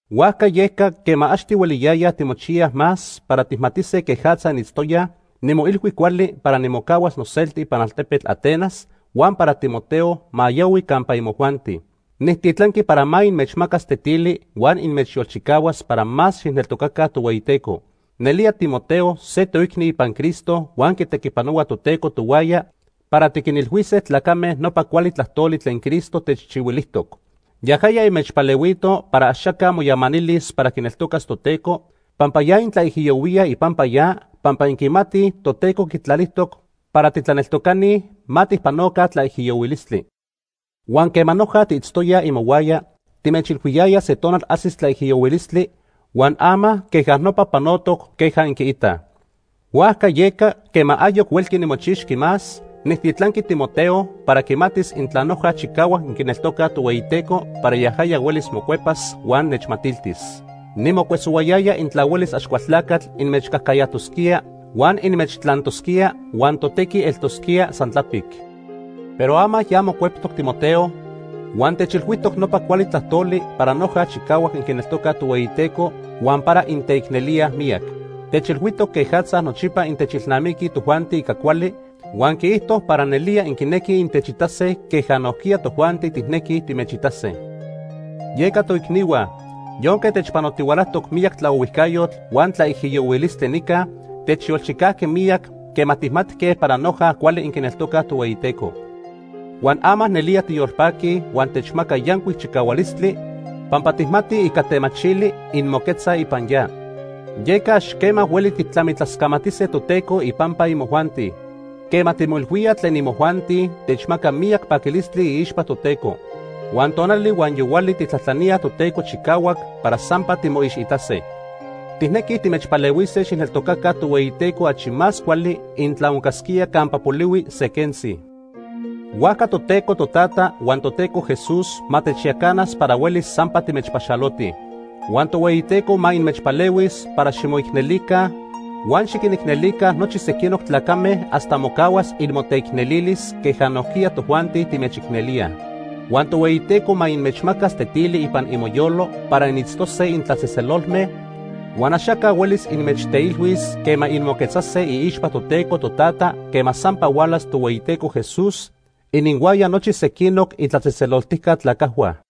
Huajca yeca, quema ax tihueliyayaj timochiyaj más para tijmatise quejatza initztoyaj, nimoilhui cuali para nimocahuas noselti ipan altepetl Atenas, huan para Timoteo ma yahui campa imojuanti. Nijtitlanqui para ma inmechmacas tetili huan inmechyolchicahuas para más xijneltocaca Tohueyiteco. Nelía Timoteo se toicni ipan Cristo huan quitequipanohua Toteco tohuaya para tiquinilhuise tlacame nopa cuali tlajtoli tlen Cristo techchihuilijtoc. Yajaya inmechpalehuito para axaca moyamanilis para quineltocas Toteco pampa ya intlaijiyohuíaj ipampa ya, pampa inquimatij Toteco quitlalijtoc para titlaneltocani ma tijpanoca tlaijiyohuilistli. Huan quema noja tiitztoyaj imohuaya, timechilhuiyayaj se tonal ajsis tlaijiyohuilistli huan ama queja nopa panotoc queja inquiitaj. Huajca yeca, quema ayoc huelqui nimochixqui más, nijtitlanqui Timoteo para quimatis intla noja chicahuac inquineltocaj Tohueyiteco para yajaya huelis mocuepas huan nechmatiltis. Nimocuesohuayaya intla huelis Axcualtlacatl inmechcajcayajtosquía huan inmechtlantosquía, huan totequi eltosquía san tlapic. Pero ama ya mocueptoc Timoteo, huan techilhuijtoc nopa cuali tlajtoli para noja chicahuac inquineltocaj Tohueyiteco huan para inteicnelíaj miyac. Techilhuijtoc quejatza nochipa intechilnamiquij tojuanti ica cuali, huan quiijto para nelía inquinequij intechitase queja nojquiya tojuanti tijnequij timechitase. Yeca toicnihua, yonque techpanotihualajtoc miyac tlaohuijcayotl huan tlaijiyohuilistli nica, techyolchicajqui miyac quema tijmatque para noja cuali inquineltocaj Tohueyiteco. Huan ama nelía tiyolpaquij huan techmaca yancuic chicahualistli pampa tijmatij ica temachili inmoquetzaj ipan ya. Yeca ax quema hueli tijtlamitlascamatise Toteco ipampa imojuanti. Quema timoilhuíaj tlen imojuanti, techmaca miyac paquilistli iixpa Toteco. Huan tonali huan yohuali tijtlajtlaníaj Toteco chicahuac para sampa timoixitase. Tijnequij timechpalehuise xijneltocaca Tohueyiteco achi más cuali intla oncasquía campa polihui se quentzi. Huajca Toteco Totata huan Toteco Jesús ma techyacanas para huelis sampa timechpaxalotij. Huan Tohueyiteco ma inmechpalehuis para ximoicnelica huan xiquinicnelica nochi sequinoc tlacame hasta mocahuas inmoteicnelilis, queja nojquiya tojuanti timechicnelíaj. Huan Tohueyiteco ma inmechmacas tetili ipan imoyolo para initztose intlatzejtzelolme, huan axaca huelis inmechteilhuis quema inmoquetzase iixpa Toteco Totata quema sampa hualas Tohueyiteco Jesús ininhuaya nochi sequinoc itlatzejtzeloltijca tlacajhua.